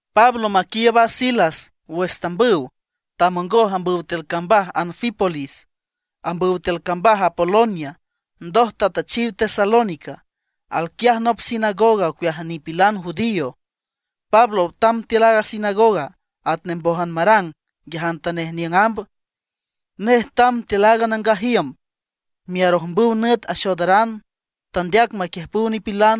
Pablo maquiiüb a Silas wüx tambüw, tamongoj ambüw tiül cambaj Anfípolis, ambüw tiül cambaj Apolonia, ndoj tatüchiw Tesalónica. Alquiaj nop sinagoga ocueaj nipilan judío. Pablo tamb tiül aaga sinagoga atnej mbójan marang nguiajantanej niüng amb. Nej tamb tiül aaga nangaj iüm miarojmbüw nüt axoodaran, tandeac maquiüjpüw nipilan.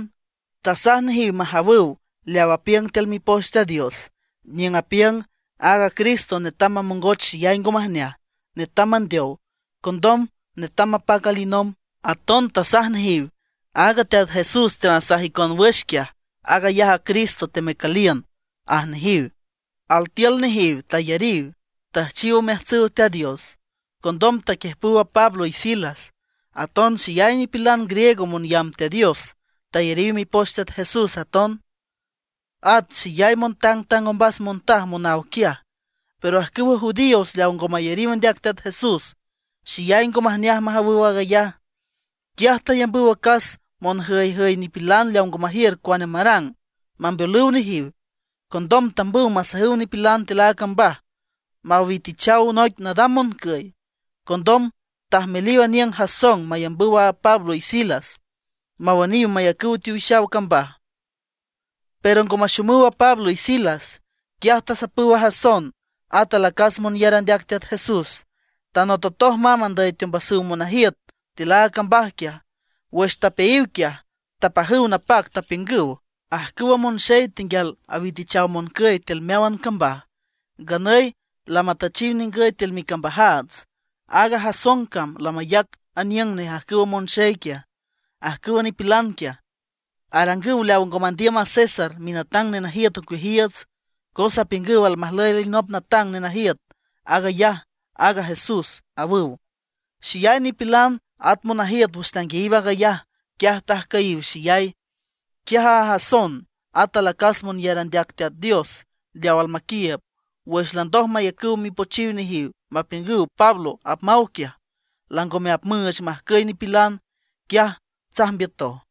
Tasaj nejiw majawüw leaw apiüng tiül Mipoch Teat Dios, niüng apiüng aaga Cristo netam mamongoch xeyay ngo majneaj, netam mandeow. Condom netam mapac alinomb. Aton tasaj nejiw: ―Aaga Teat Jesús teanasaj icon wüx quiaj, aag ayaj a Cristo temecüliün ―aj nejiw. Altiül nejiw tayariw, tüjchiw omeajtsüw Teat Dios; condom taquiüjpüw a Pablo y Silas. Aton xeyay nipilan griego monyamb Teat Dios tayariw mipoch Teat Jesús aton, at xeyay montangtang ombas montaj monaw quiaj. Pero ajcüwa judíos leaw ngo mayariw andeac Teat Jesús, xeyay ngo majneaj majawüw aag ayaj. Quiaj tayambüw acas monjüyjüy nipilan leaw ngo majiür cuane marang, mambeolüw nejiw. Condom tambüw masajüw nipilan tiül a cambaj, mawitichaw noic nadam moncüy. Condom tajmeliw aniüng Jasón mayambüw a Pablo y Silas mawüniw mayacüw teowix cambaj. Pero ngo maxomüw a Pablo y Silas, quiaj tasapüw a Jasón, at alacas monyar andeac Teat Jesús, tanototoj mamb andüy teombasüw monajiüt tiül aaga cambaj quiaj. Wüx tapeayiw quiaj, tepajüw napac, tapiüngüw: ―Ajcüwa monxey tenguial awitichaw moncüy tiül meáwan cambaj, nganüy lamatüchiw ningüy tiül micambajaats. Aaga Jasón cam lamayac aniüng nej ajcüwa monxey quiaj. Ajcüwa nipilan quiaj, arangüw leaw ngo mandiüm a César minatang nenajiüt ocueajiiüts. Cos apiüngüw almajlüy alinop natang nenajiüt, aag ayaj aaga Jesús ―awüw. Xeyay nipilan at monajiüt wüx tanguiayiw aag ayaj, quiaj tajcüyiw xeyay. Quiaj a Jasón at alacas monyar andeac Teat Dios leaw almaquiiüb, wüx landoj mayacüw mipochiw nejiw mapiüngüw Pablo apmaw quiaj, langome apmüüch majcüy nipilan, quiaj tsajmbiütoj.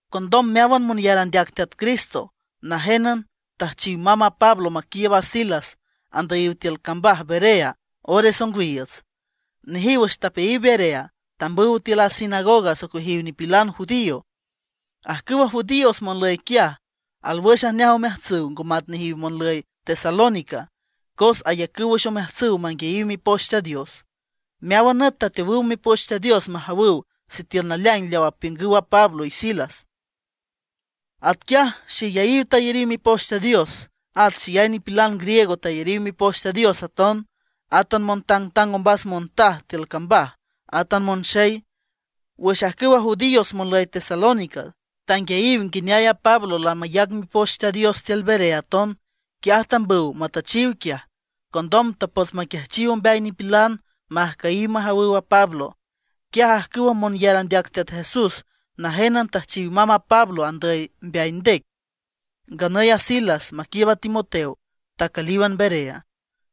Condom meáwan monyar andeac Teat Cristo najénan tüjchiw mamb a Pablo maquiiüb a Silas andüyiw tiül cambaj Berea ores ongwiiüts. Nejiw wüx tapeayiw Berea, tambüw tiül a sinagoga ocueajiw nipilan judío. Ajcüwa judíos monlüy quiaj, alwüx ajneaj omeajtsüw ngo mat nejiw monlüy Tesalónica, cos ayacüw wüx omeajtsüw manguiayiw Mipoch Teat Dios. Meáwan nüt tateowüw Mipoch Teat Dios majawüw sitiül naleaing leaw apiüngüw a Pablo y a Silas. Atquiaj xeyayiw tayariw Mipoch Teat Dios, at xeyay nipilan griego tayariw Mipoch Teat Dios aton; átan natangtang ombas montaj tiül cambaj, átan monxey. Wüx ajcüwa judíos monlüy Tesalónica, tanguiayiw nguineay a Pablo lamayac Mipoch Teat Dios tiül Berea aton, quiaj tambüw matüchiw quiaj. Condom tapots maquiajchiw ombeay nipilan majcüyiw majawüw a Pablo. Quiaj ajcüwa monyar andeac Teat Jesús najénan tüjchiw mamb a Pablo andüy mbeay ndec. Nganüy a Silas maquiiüb a Timoteo tacülíwan Berea.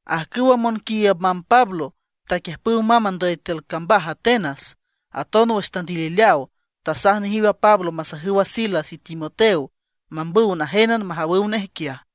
Ajcüwa monquiiüb mamb Pablo, taquiüjpüw mamb andüy tiül cambaj Atenas. Condom wüx tandilileaw, tasaj nejiw a Pablo masajüw a Silas y Timoteo, mambüw najénan majawüw nej quiaj.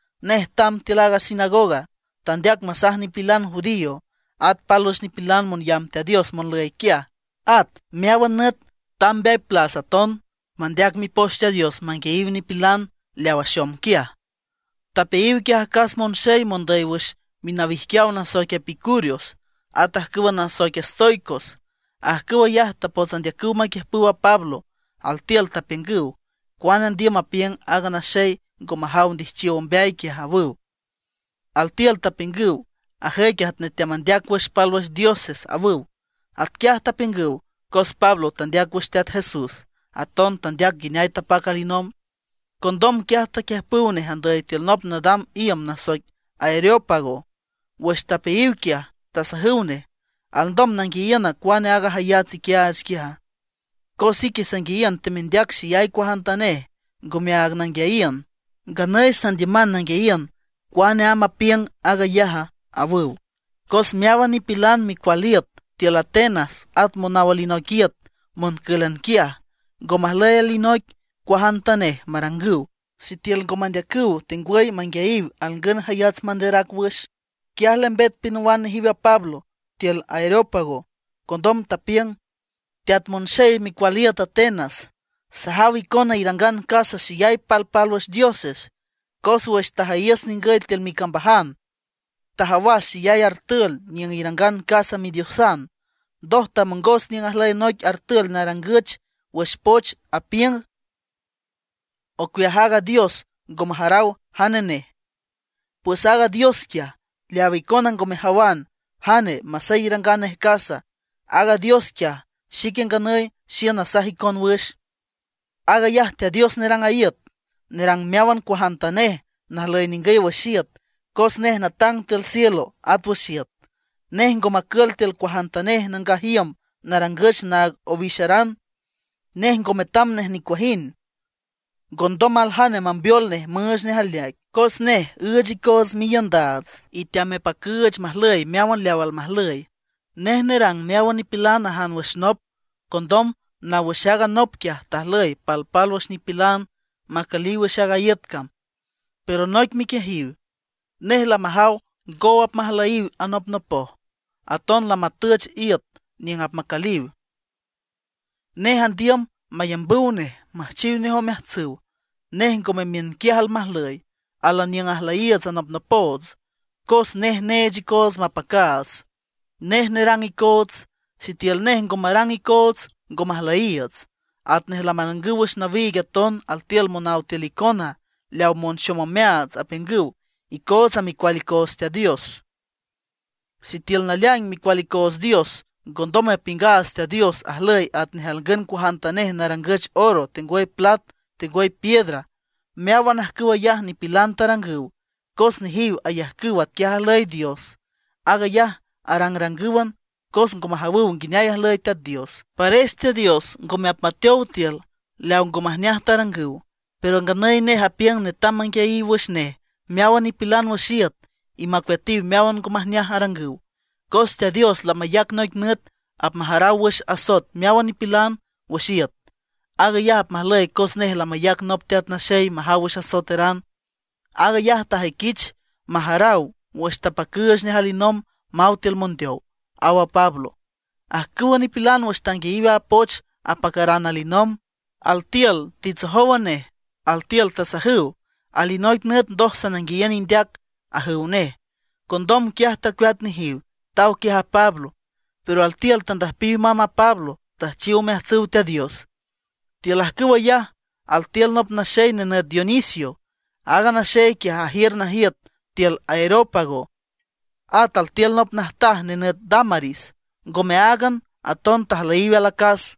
Nej tamb tiül a sinagoga, tandeac masaj nipilan judío at pálwüx nipilan monyamb Teat Dios monlüy quiaj. At meáwan nüt tamb mbeay plas aton mandeac Mipoch Teat Dios manguiayiw nipilan leaw axom quiaj. Tapeayiw quiaj acas monxey mondüy wüx minawijquiaw nasoic epicúreos at ajcüwa nasoic estoicos. Ajcüw ayaj tapots andeacüw maquiüjpüw a Pablo, altiül tapiüngüw: ―¿Cuane andiüm mapiüng aaga naxey ngo majaw ndijchiow ombeay quiaja? ―awüw. Altiül tapiüngüw: ―Ajüic atnej teamandeac wüx pálwüx dioses ―awüw. Atquiaj tapiüngüw, cos Pablo tandeac wüx Teat Jesús, aton tandeac nguineay tapac alinomb. Condom quiaj taquiüjpüw nej andüy tiül nop nadam iüm nasoic Areópago. Wüx tapeayiw quiaj, tasajüw nej: ―¿Alndom nanguiayiüna cuane aaga jayats iquiaach quiaja? Cos ique sanguiayiün temendeac xeyay cuajantanej ngome aag nanguiayiün. Nganüy sandiüman nanguiayiün cuane amb apiüng aag ayaj ―awüw. Cos meáwan nipilan micual iüt tiül Atenas at monaw alinoic iüt moncǘlan quiaj, ngo majlüy alinoic cuajantanej marangüw, sitiül ngo mandeacüw tengwüy manguiayiw alngün jayats manderac wüx. Quiaj lembet pinawan nejiw a Pablo tiül Areópago. Condom tapiüng: ―Teat monxey micual iüt Atenas, sajaw icona irangan casa xeyay palpálwüx dioses. Cos wüx tajüyiüs ningüy tiül micambajan, tajawas xeyay artül niüng irangan casa midiosan. Ndoj tamongos niüng ajlüy noic artül narangüch wüx poch apiüng: “Ocueaj aaga dios ngo majaraw jane nej”. Pues aaga dios quiaj, leawa icona ngo mejawan jane masey irangan nej casa, aag Dios quiaj xique nganüy xiün nasaj icon wüx. ’Aag ayaj Teat Dios nerang iüt, nerang meáwan cuajantanej najlüy ningüy wüx iüt, cos nej natang tiül cielo at wüx iüt. Nej ngo macül tiül cuajantanej nangaj iüm narangüch naag owixaran. Nej ngo metam nej nicuajind, ngondom aljane mambeol nej müüch nej aleaic, cos nej üüch icoots miiündaats, y teamepacüüch majlüy meáwan leaw almajlüy. ’Nej nerang meáwan nipilan ajan wüx nop. Condom naw wüx aaga nop quiaj tajlüy palpálwüx nipilan macüliw wüx aaga iüt cam, pero noic miquiejiw. Nej lamajaw ngow apmajlüyiw anopnopoj, aton lamüüch iüt niüng apmacüliw. Nej andiüm mayambüw nej, müjchiw nej omeajtsüw. Nej ngome miünquiaj almajlüy, álan niüng ajlüyiiüts anopnopoots. Cos nej neech icoots mapacaats, nej nerang icoots. Sitiül nej ngo marang icoots, ngo majlüyiiüts. Atnej lamarangüw wüx nawiig aton altiül monáwan tiül icona leaw monxom omeaats, apiüngüw: “Icootsa micual icoots Dios.” Sitiül naleaing micual icoots Dios, ngondom mapiüngaats Teat Dios ajlüy atnej alngün cuajantanej narangüch oro, tengwüy plat, tengwüy piedra. Meáwan ajcüw ayaj nipilan tarangüw, cos nejiw ayajcüw atquiaj ajlüy Dios. Aag ayaj arangrangǘwan, cos ngo majawüw nguineay ajlüy Teat Dios. Pares Teat Dios ngome apmateow tiül leaw ngo majneaj tarangüw; pero nganüy nej apiüng netam manguiayiw wüx nej meáwan nipilan wüx iüt y macueatiw meáwan ngo majneaj arangüw. Cos Teat Dios lamayac noic nüt apmajaraw wüx asoet meáwan nipilan wüx iüt. Aag ayaj apmajlüy cos nej lamayac nop Teat Naxey majaw wüx asoeteran. Aag ayaj tajüiquich majaraw wüx tapacüüch nej alinomb maw tiül mondeow ―aw a Pablo. Ajcüwa nipilan wüx tanguiayiw aaga poch apacaran alinomb, altiül titsojówan nej, altiül tasajüw: ―Alinoic nüt ndoj sananguiayiün indeac ―ajüw nej. Condom quiaj tacueat nejiw, taw quiaj a Pablo. Pero altiül tandüjpiw mamb a Pablo, tüjchiw omeajtsüw Teat Dios. Tiül ajcüw ayaj, altiül nop naxey nenüt Dionisio. Aaga naxey quiaj, ajiür najiüt tiül Areópago. At altiül nop najtaj nenüt Dámaris. Ngome áagan, aton tajlüyiw alacas.